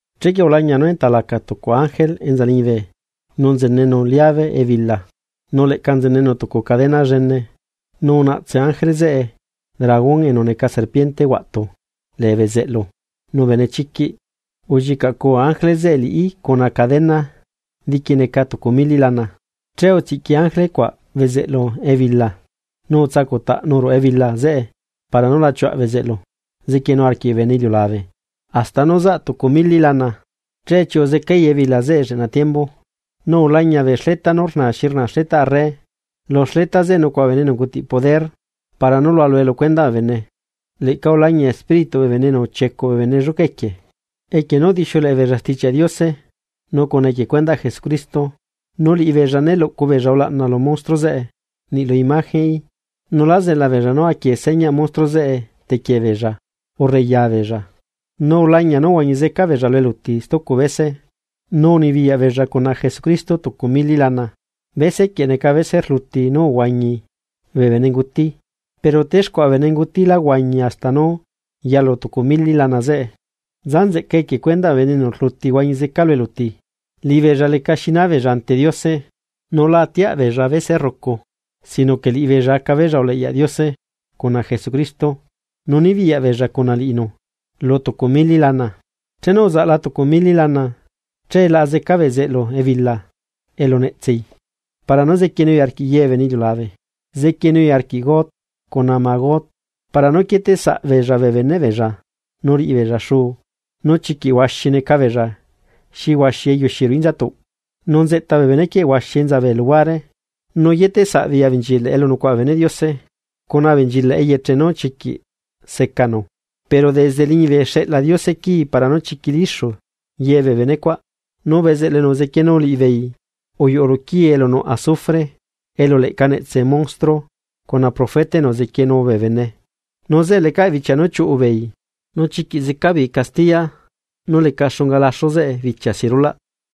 Chequie ulañia nú enta laca tucu ángele enza liñibe nu nzenenu liave ebila, nu leꞌca nzenenu tucu cadena llene. Nu unaꞌtse ángele zeꞌe dragón enu neca serpiente huaꞌtu lee bezeꞌlu nu benechiquiꞌ ullicaꞌcuu ángele zeꞌe liꞌi cuna cadena diqui neca tucu mili lana. Che utsiꞌqui ángele cuaꞌ bezeꞌlu ebila nu utsacuꞌtaꞌnu ruꞌu ebila zeꞌe para nu la chiuaꞌ bezeꞌlu zequienu arquiꞌ bee bene iliulabe hasta nú zaꞌ tucu mili lana, che chiuꞌu zecai ebila lleꞌna tiembu. Nu ulañia bee xleta nú rnaa xi rnaa xletaꞌ arre, lu xleta zeꞌe nucuaꞌa bee bene enu ungutiꞌ poder para nú lualue lu cuendaꞌ bee bene. Leꞌca ulañia espírituꞌ bee bene enu uchiecuꞌ bee bene lluca equie, equie nú udixiuleꞌe beella Stichiaꞌ Diose nu cuna equie cuendaꞌ Jesucristo. Nu liꞌibeella né luꞌcu beella ulaꞌna lu monstruo zeꞌe niꞌlu imagenꞌí nu lá zela beella nú aquie señaꞌ monstruo zeꞌe tequie beella urre yabeella. Nu ulañia nú uhuañi zeca beella lu eluti stucu bese, nu unibiyaꞌ beella cuna Jesucristo tucu mili lana. Bese quieꞌ neca bese rluti nú uhuañi bee benenguti, pero texcuaꞌa bee benenguti la huañi hasta nú yalu tucu mili lana zeꞌe. ¡Nza nzeꞌcae equie cuendaꞌ bee bene enu rluti huañi zeca lu eluti! Liꞌibeella lecaꞌ xinaa beella ante Diose, nu la atiaꞌ beella bese rrucu sino que liꞌibeella aca beella uleꞌyaꞌ Diose cuna Jesucristo nu nibiyaꞌ beella cuna liꞌinu lu tucu mili lana. Chenu uzaꞌla tucu mili lana, che laꞌa zeca bezeꞌlu ebila elu netsei, para nú zequienui arquiꞌ ye bee bene iliulabe. Zequienui arquiꞌ Gog cuna Magog, para nú quieteꞌsaꞌ beella bee beneꞌ beella nu rriꞌibeella xuu. Nu chiquiꞌ huaxi neca beella xi huaxi eyuxi ruꞌu inzatuꞌ. Nu nzeꞌta bee benequieꞌ enza huaxi bee luhuare, nu yeteꞌsaꞌbeei abenchilaꞌ elu nucuaꞌa bee beneꞌ Diose, cuna abenchilaꞌ eyeche nú chiquiꞌ secanu. Pero desde liñibe xeꞌla Diose quii para nú chiquilixu ye bee benecuaꞌ. Nu bezeꞌlu enu uzequienu liꞌibeei uyuꞌu luquii elu nuꞌ azufre, elu leꞌca netsela monstruo cuna profeta enu uzequienu bee bene, nu zeꞌe lecaꞌ bichia nú chiuꞌu beei, nu chiquiꞌ zeca beei castiya nú leca xunga laxu bichia si rulaꞌ.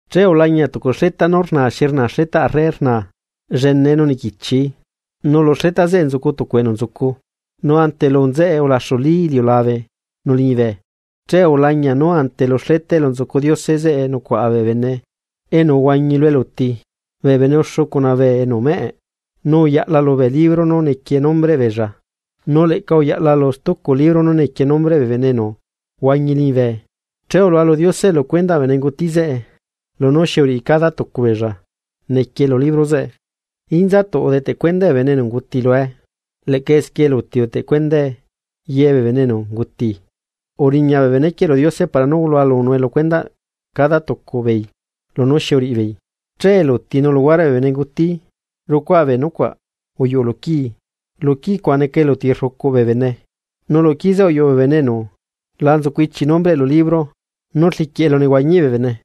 Che ulañia tucu xleta nú rnaa xi rnaa xletaꞌ arre, llenee nu niquichi. Nu lu xleta zeꞌe nzucu tucu enu nzucu. Nu ante lu nzeꞌe ulaxulí iliulabe nu liñibe. Che ulañia nú ante lu xleta elu nzucu Diose, zeꞌe nucuaꞌa bee bene enu uhuañi lu eluti bee bene uxu cuna bee enu meꞌe. Nu uyaꞌla lubee libro nú nequie nombreꞌ beella, nu leꞌca uyaꞌla lu stucu libro nú nequie nombreꞌ bee bene enu huañi liñibe. Che ulualu Diose lucuendaꞌ bee benenguti zeꞌe, lunú xi uriꞌi cada tucu beella nequie lu libro zeꞌe. Inzatuꞌ udeteꞌ cuendae bee bene enu unguti lue, leꞌca esquie eluti udeteꞌ cuendae ye bee bene enu unguti, uriña bee benequieꞌ lu Diose para nú lualunue lu cuendaꞌ cada tucu beei lunú xi uriꞌibeei. Che eluti, nu luhuareꞌ bee benenguti, rucuaa bee nucuaꞌ uyuꞌu luquii, lu quii cuaꞌ neca eluti rrucuꞌ bee bene. Nu luquii zeꞌe uyuꞌu bee bene enu la nzucu ichi nombreꞌ lu libro nú rliquiꞌ elunehuañiꞌ bee bene.